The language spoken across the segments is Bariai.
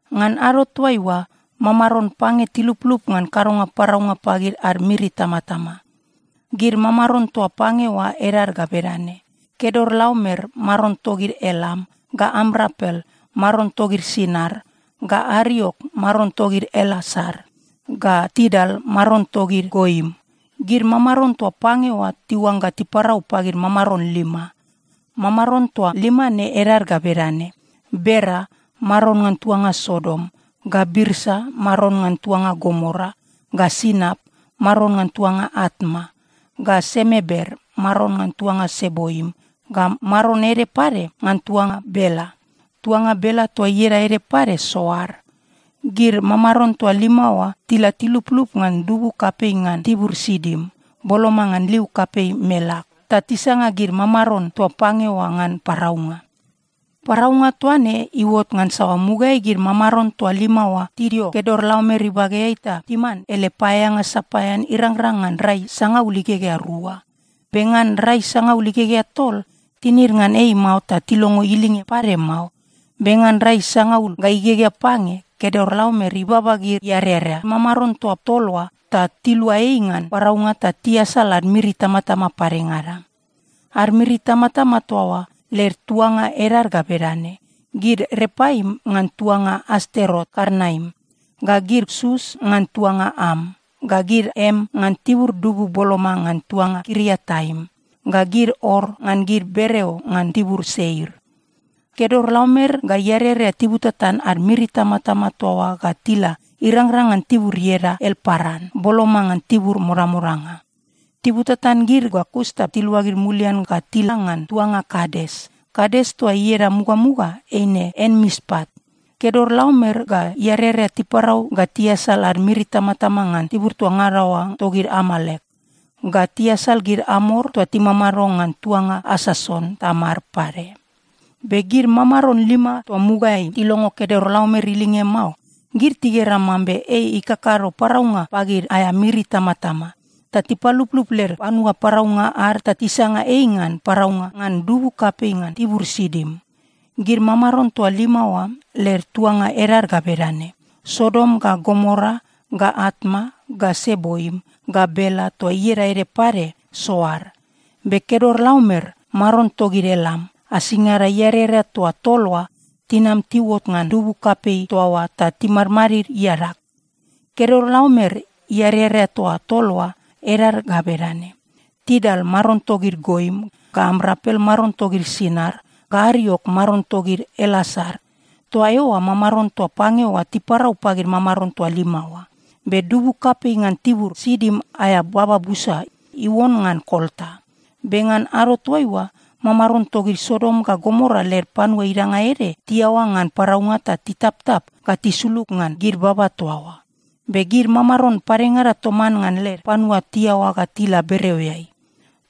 Ngan ado toaiua, mamaron pange tiluplup ngan kadonga paraunga pagid ad miri itamatama. Gid mamaron toa pange oa edad ga bedane: Kedorlaomer (maron togid Elam) ga Amrapel (maron togid Sinar) ga Ariok (maron togid Elasar) ga Tidal (maron togid Goim). Gid mamaron toa pange oa tiuangga tiparau pagid mamaron lima. Mamaron toa lima ne edad ga bedane: Bera (maron ngan tuanga Sodom) ga Birsa (maron ngan tuanga Gomora) ga Sinap (maron ngan tuanga Atma) ga Semeber (maron ngan tuanga Seboim) ga maron ede pade ngan tuanga Bela. (Tuanga Bela toa ieda ede pade Soar.) Gid mamaron toa lima oa tila tiluplup ngan dubu kapei ngan tibur Sidim, boloma ngan liu kapei Melak, ta tisanga gid mamaron toa pange oa ngan paraunga. Paraunga toa ne iuot ngansa mugaeai gid mamaron toa lima oa tidio Kedorlaomer ibageai ta timan ele paeaeanga sapaean irangrang ngan rai sangaul igegea rua. Be ngan rai sangaul igegea tol, tinid ngan ei mao ta tilongo ilinge pade mao. Be ngan rai sangaul ga igegea pange, Kedorlaomer ibaba gid iarerea, mamaron toa tol oa, ta tilua ei ngan paraunga ta tiasal ad miri itamatama padengada. Ad miri itamatama toa oa led tuanga edad ga bedane: gid Repaim ngan tuanga Asterot-Karnaim, ga gid Sus ngan tuanga Am, ga gid Em ngan tibur dubu boloma ngan tuanga Kiriataim, ga gid Or ngan gid bereo ngan tibur Seir. Kedorlaomer ga iarerea tibutatan ad miri itamatama toa oa ga tila irangrang ngan tibur ieda Elparan, boloma ngan tibur modamodanga. Tibutatan gid ga kus ta tiluagid mulian ga tila ngan tuanga Kades. (Kades toa ieda mugamuga eine Enmispat.) Kedorlaomer ga iarerea tiparau ga tiasal ad miri itamatama ngan tibur toa ngada oa togid Amalek, ga tiasal gid Amor toa timamado ngan tuanga Asason-Tamar pade. Be gid mamaron lima toa mugaeai tilongo Kedorlaomer ilinge mao, gid tigera mambe ei ikakado paraunga pagid aea miri itamatama, ta tipaluplup led panua paraunga ad ta tisanga ei ngan paraunga ngan dubu kapei ngan tibur Sidim. Gid mamaron toa lima oa led tuanga edad ga bedane: Sodom ga Gomora ga Atma ga Seboim ga Bela toa ieda ede pade Soar. Be Kedorlaomer (maron togid Elam) asingada iarerea toa tol oa tinam tiuot ngan dubu kapei toa oa ta timadmadid iadag. Kedorlaomer iarerea toa tol oa edad ga bedane: Tidal (maron togid Goim) ga Amrapel (maron togid Sinar) ga Ariok (maron togid Elasar). Toa eoa mamaron toa pange oa tiparau pagid mamaron toa lima oa. Be dubu kapei ngan tibur Sidim aea baba busa iuon ngan kolta. Be ngan ado toaiua, mamaron togid Sodom ga Gomora led panua idanga ede tiaoa ngan paraunga ta titaptap ga tisulug ngan gid baba toa oa. Be gid mamaron padengada toman ngan led panua tiaoa ga tila bereoeai.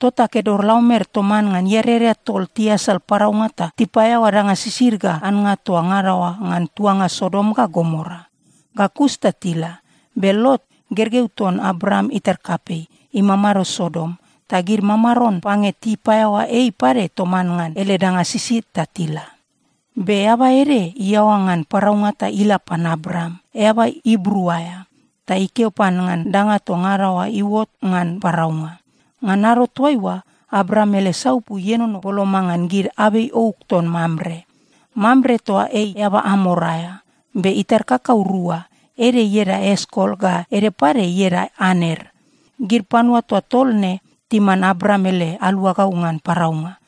Tota Kedorlaomer toman ngan iarerea tol tiasal paraunga ta tipaeaoa danga sisid ga annga toa ngada oa ngan tuanga Sodom ga Gomora. Ga kus ta tila. Be Lot, gergeu ton Abram itar kapei, imamado Sodom, ta gid mamaron pange tipaeaoa ei pade toman ngan ele danga sisid ta tila. Be eaba ede iaoa ngan paraunga ta ila pan Abram, eaba Ibru aea, ta ikeo pan ngan danga toa ngada oa iuot ngan paraunga. Ngan ado toaiua, Abram ele saupu ienono boloma ngan gid abei ouk ton Mamre. Mamre toa ei eaba Amor aea, be itar kakau rua. Ede ieda Eskol ga ede pade ieda Aner. Gid panua toa tol ne timan Abram ele aluagau ngan paraunga.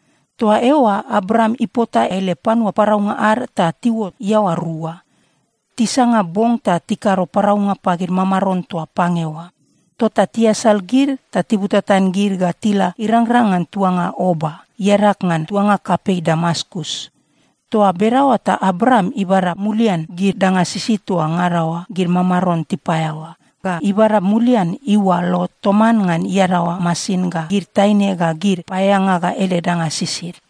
Toa eoa Abram ipota ele panua paraunga ad ta tiuot iaoa rua. Tisanga bong ta tikado paraunga pagid mamaron toa pange oa. Tota tiasal gid ta tibutatan gid ga tila irangrang ngan tuanga Oba, iadag ngan tuanga kapei Damaskus. Toa bedaoa ta Abram ibada mulian gid danga sisid toa ngada oa gid mamaron tipaeaoa, ga ibada mulian iua Lot toman ngan iadaoa masin ga gid taine ga gid paeaeanga ga ele danga sisid.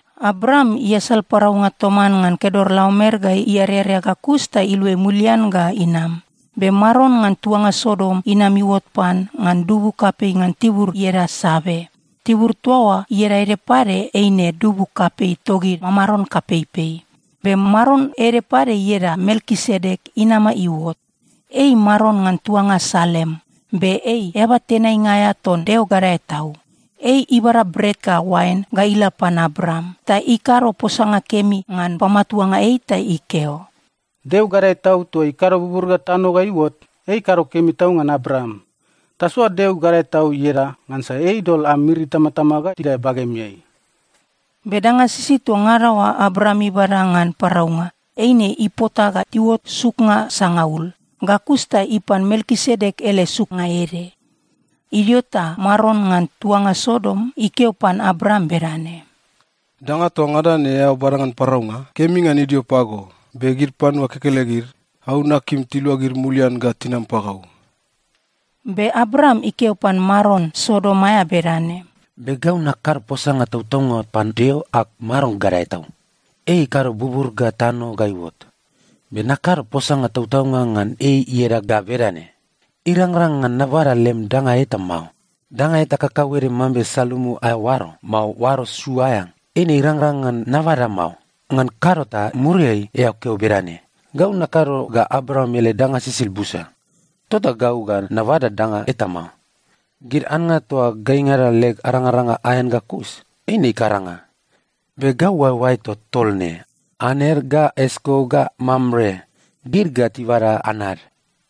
Abram iasal paraunga toman ngan Kedorlaomer ga iarerea ga kus ta iluai mulian ga inam. Be maron ngan tuanga Sodom inam iuot pan ngan dubu kapei ngan tibur ieda Save. (Tibur toa oa ieda ede pade eine Dubu Kapei Togid Mamaron Kapeipei.) Be maron ede pade ieda Melkisedek inama iuot. Ei maron ngan tuanga Salem be ei eaba tenainga aea ton Deo Gadae Tau. Ei ibada bret ga oain ga ila pan Abram ta ikado posanga kemi ngan pamatuanga ei ta ikeo, “Deo Gadae Tau toa ikado bubur ga tano ga iuot, ei ikado kemi tau ngan Abram. Tasoa Deo Gadae Tau ieda, ngansa ei idol am miri itamatama ga tidae bagemeai.” Be danga sisid toa ngada oa Abram ibada ngan paraunga, eine ipota ga tiuot suknga sangaul. Ga kus ta ipan Melkisedek ele suknga ede. Idio ta maron ngan tuanga Sodom ikeo pan Abram bedane, “Danga toa ngada ne eao bada ngan paraunga, kemi ngan idio pago, be gid panua kekelegid, gau nakim tiluagid mulian ga tinam pagau.” Be Abram ikeo pan maron Sodom aea bedane, “Be gau nakado posanga tautaunga pan Deo ag Maron Gadae Tau. Ei ikado bubur ga tano ga iuot, be nakado posanga tautaunga ngan ei ieda ga bedane: Irangrang ngan nabada lem danga eta mao. Danga eta kakauede mambe salumu aea oaro, mao oaro su aea, eine irangrang ngan nabada mao. Ngan kado ta muriai eao keo bedane, ‘Gau nakado ga Abram ele danga sisid busa.’ Tota gau ga nabada danga eta mao. Gid annga toa gaingada leg arangaranga aean ga kus, eine ikaranga. Be gau oaeoaeg toa tol ne, Aner ga Eskol ga Mamre, gid ga tibada anad.”